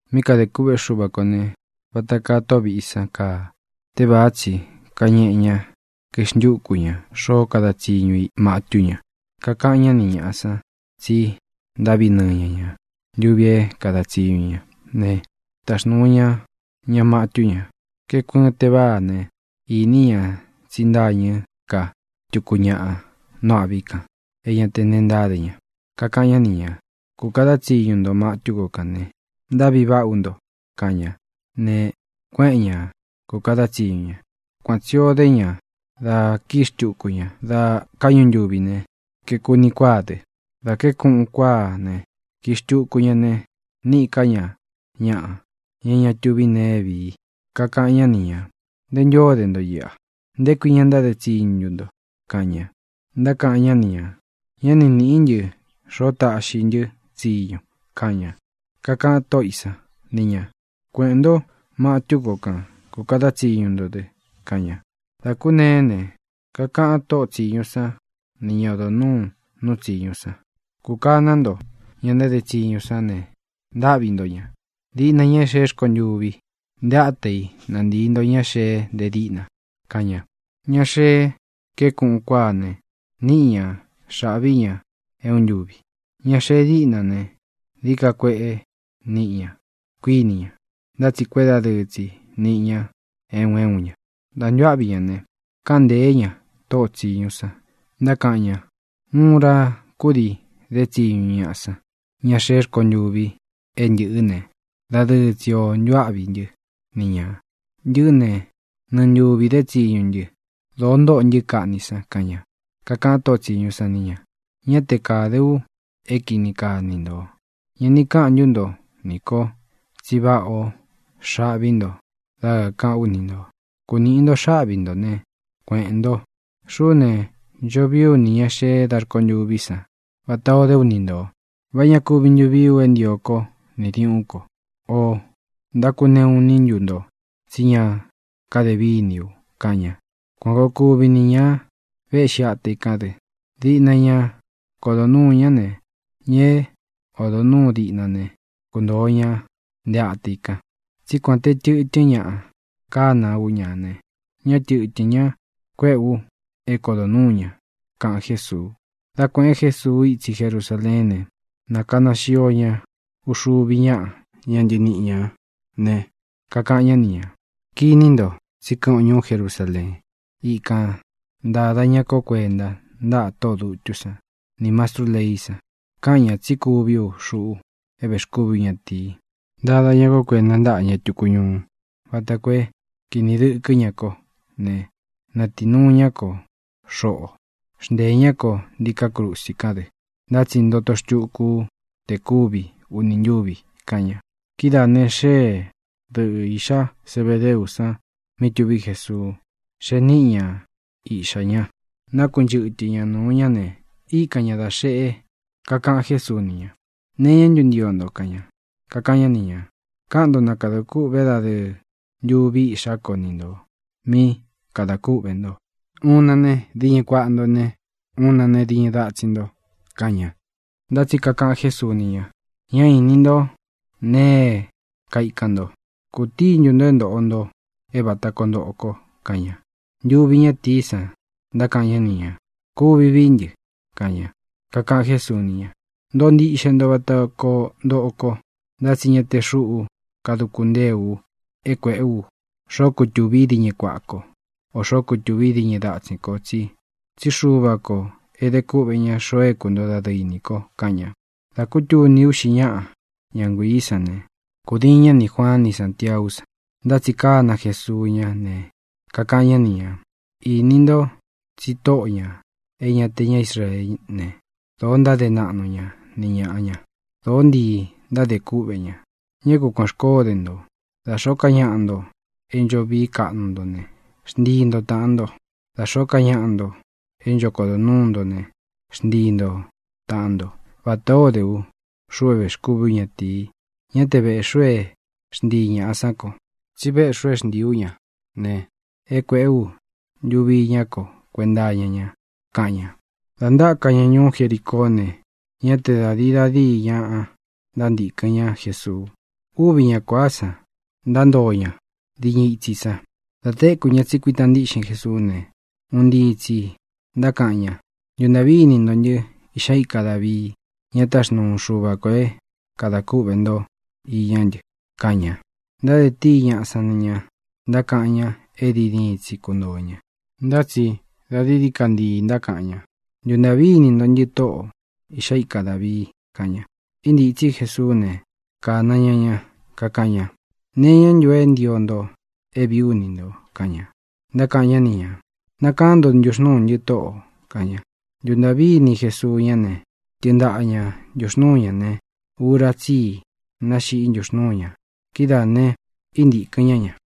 ʼMí kadē kûꞌvé Xuva kō ne, vata kaa tóꞌo vīꞌí san kaa. Tévāá tsi kañeꞌe ñá, kaixntuku ñā xoó kada tsiñu i matú ña. Kakaꞌan ñá ni ñāꞌa san tsi ntáꞌvi nɨɨ ña ña ntūvi é kāda tsiñu ña ne, taxnūu ña ña matú ña. Kaeku ɨɨn teváa ne, īní ña tsi ntâñɨ́ ka tuku ñaꞌa nú āꞌví kān é ña te neé ntáde ña. Kakaꞌan ñá ni ñā: “Kūkada tsiñu nto matú ko kān ne, ntáꞌvi vaꞌa ú nto”, kaꞌan ña. Ne, kuéꞌen ña kūkada tsiñu ña. Kuan tsī ó de ña dá kii xtúku ña da káꞌñu ntuvi ne, kaeku uni kuáa dɨ. Dā kaéku uꞌun kuáa ne, kii xtūku ña ne, níꞌī ká ña ñaꞌa, ña é ña tuví nee é vii. Kakaꞌan ñá ni ñā: “¿Nté ntū ó de nto iꞌa? ¿Nté kui ña ntáde tsiñu ntu nto?”, kaꞌan ña. Ntákaꞌan ñá ni ñā: “Ñá ni nīꞌí ntɨ xoó taꞌxi i ntɨ́ tsiñu”, kaꞌan ña. Kakaꞌan tóꞌo ī sán ni ñā: “Kueꞌēn ntó matú ko kan kūkada tsiñu nto dɨ”, kaꞌan ña. Dā kúneé ne, kakaꞌan tóꞌo tsīñu sán ni ña odo nūú nuu tsiñú san: “Kūkaná nto ña ntáde tsiñu sán ne, ntáꞌvi nto ñā, diꞌna ña é xeé rkontuvi. Nté ata i na ntīi ña xee nte díꞌna”, kaꞌan ña. Ña xee kaéku uꞌun kuáa ne, níꞌi ña xāꞌví ña é uun ntúvi. Ña xee díꞌna ne, dií ka kueꞌe níꞌi ña, kuíni ña. Ntá tsi kuédadɨɨ tsi niꞌi ña é un é un ñā. Dā ntuáꞌvi ña ne, káꞌan ntēé ña tóꞌo tsīñu san, ntákaꞌan ña: “Uun ura kúdii dé tsiñu ñaꞌa san, ña xeé rkontuvi é ntɨꞌɨ́ ne, dadɨɨ tsi o ntuáꞌvī ntɨ́ ni ñā. Ntɨꞌɨ́ ne, nɨɨ ntuvī dé tsiñu ntɨ. Dōo ntóꞌo ntɨ́ kaꞌni san”, kaꞌan ña. Kakaꞌan tóꞌo tsīñu san ni ña: “Ñá te kāde u é kini kaa ni ntō. ¿Ña ni káꞌan ntú nto nī ko tsi váꞌā o xaꞌví nto dá kākaꞌán u ni ntō? Kūniꞌi nto xáꞌvi ntō né, kueꞌēn nto. Xuꞌú ne, ncho vii ú nī ña xee da rkontuví san vatā o dé u ni ntō. ¿Vá ña kuvi ntu vií u é ntio kó nī diuꞌún ko? ¿Ō ntákuneꞌu iní ntu nto tsí ña kade víni u?”, kaꞌan ña. Kuan kōo kuvi ni ña véꞌxi ata i kán dɨ; diꞌna ña kodo núu ña ne, ña é odo nūú diꞌna ne, kuntōo ña nte ata i kan. Tsí kuān te tɨtɨ́n ñaꞌa kana ú ña ne, ñá tɨ̄tɨ́n ña kuéꞌe u é kodo nuū ña —kaꞌan Jésuu. Dá kuēꞌen Jésuu itsi Jerusaleén ne, nakana xio ña uxuvi ñáꞌa ña ntɨniꞌi ñā ne, kakaꞌan ñá ni ñā: —Kiní nto, tsí kɨꞌɨn o ñuú Jerusaleen. Ikān ntada ña kó kuenta ntáꞌa tóꞌō dutú san nī mastrú leí san. Káꞌan ñā tsí kuví u, xuꞌu é vēxkúvi ú ñatīi. Ntada ña kó kuenta ntáꞌa ña tuku ñuú vata koo é kīni dɨ́kɨ ña ko ne, natii nuu ña kó xoꞌo. Xnteē ñá ko ntiká krusi kán dɨ. Ntá tsi ntoto xtuku ú te kuvi ūni ntúvi —kaꞌan ña. Kidáā ne, xée dɨꞌɨ īꞌxá Zebedeú san mí tuví Jesuu, xee níꞌi ña iꞌxā ña. Nakunchɨtɨ ña nūu ña ne, íkan ña da xeꞌe. Kakaꞌan Jésuu ni ña: —¿Nee iñá ntu ntio nto? —kaꞌan ña. Kakaꞌan ñá ni ñā: —Káꞌan nto na kadā kûꞌvé dadɨɨ ntuvi iꞌxá ko ni ntō mí kadā kúꞌvē nto; uun chí ne, diñɨ kuaꞌa nto ne, uun chí ne, diñɨ datsin nto —kaꞌan ña. Ntá tsi kakaꞌan Jésuu ni ña: —Ñá īni nto nee é kaikan nto. ¿Kūtíi ntu ntō é ntōꞌo nto é vāta koo ntoꞌo ko? —kaꞌan ña. Ntuvi ñátīí san ntákaꞌan ñá ni ñā: —Kuvi vií ntɨ —kaꞌan ña. Kakaꞌan Jésuu ni ña: —Ntoꞌo ntiꞌxe nto vata koo ntoꞌo ko, ntá tsi ña te xúꞌú kaduku ntée u é kuēꞌé u xoó kutūvi í diñɨ kuaꞌa kó, ō xoó kutūvi í diñɨ datsin ko, tsí Xuvā ko e dé kuꞌvē ña xoo é kuntoo dadɨɨ i nī ko —kaꞌan ña. Dā kútuni uꞌxi ñáꞌa ña nguiī sán ne, kūdiin ñá nī Juaan ni Sántiaú san. Ntá tsi kána Jesuu ñá ne, kakaꞌan ñá ni ñā: —Īni ntó tsi tóꞌō ña é ña te ñá Israeé ne, dōo ntáde naꞌnu ña ni ñāꞌa ña. Dōó ntii ntádē kúꞌvē ña. Ñá ku kuān xkoó de nto. Da xōó ka ñaꞌa nto é ncho vií kaꞌnu nto ne, xntii nto tāꞌan nto. Da xōó ka ñaꞌa nto é ncho kodo nuū ntó ne, xntii nto tāꞌan ntó, vatā ó de ú, xuꞌu é vēxkúvi ú ñatīi. Ñá te vēꞌxi u é xntii ñāꞌa sán ko, tsí véꞌxī u é xntīi ú ña ne, é kuēꞌé u ntuvi iñá ko kuenta iña ña —kaꞌan ña. Dā ntáka ña ñuú Jericoó ne, ñá te da dīi da díi ñaꞌa ntántīkɨn ñá Jesuu. Uvi ñá kuāa san ntántoo ña diñɨ itsi san. Dā téku ña tsi kuítā ntiꞌxin Jesuú ne, un ntii tsī ntákaꞌan ña: —¡Ntuntāꞌví ini nto ntɨ́, Iꞌxá ika Dāvii, ña táxnuu Xuva kō é kadā kúꞌvē ntó iñá ntɨ! —kaꞌan ña. Ntáde tíi ñaꞌa san ni ña, ntákaꞌan ña é diin diin tsi kuntōo ña. Ntá tsi da dií dií ka ntii ntákaꞌan ña: —¡Ntuntāꞌví ini nto ntɨ, Tóꞌō, Iꞌxá ika Dāvii! —kaꞌan ña. Íntītsí Jesuú ne, kāna ña ña. Kakaꞌan ña: —¿Nee iñá ntu é ntio nto é vīí u ni ntō? —kaꞌan ña. Ntákaꞌan ñá ni ñā: —Nakaán nto ntuxnūú ntɨ, Tóꞌō —kaꞌan ña. Ntuntāꞌví ini Jesuu ñá ne, tɨɨn ntaꞌa ña ntūxnúu ñā ne, ura tsí i náxiꞌí ntuxnūú ña. Kidáā ne, íntīkɨn ñá ña.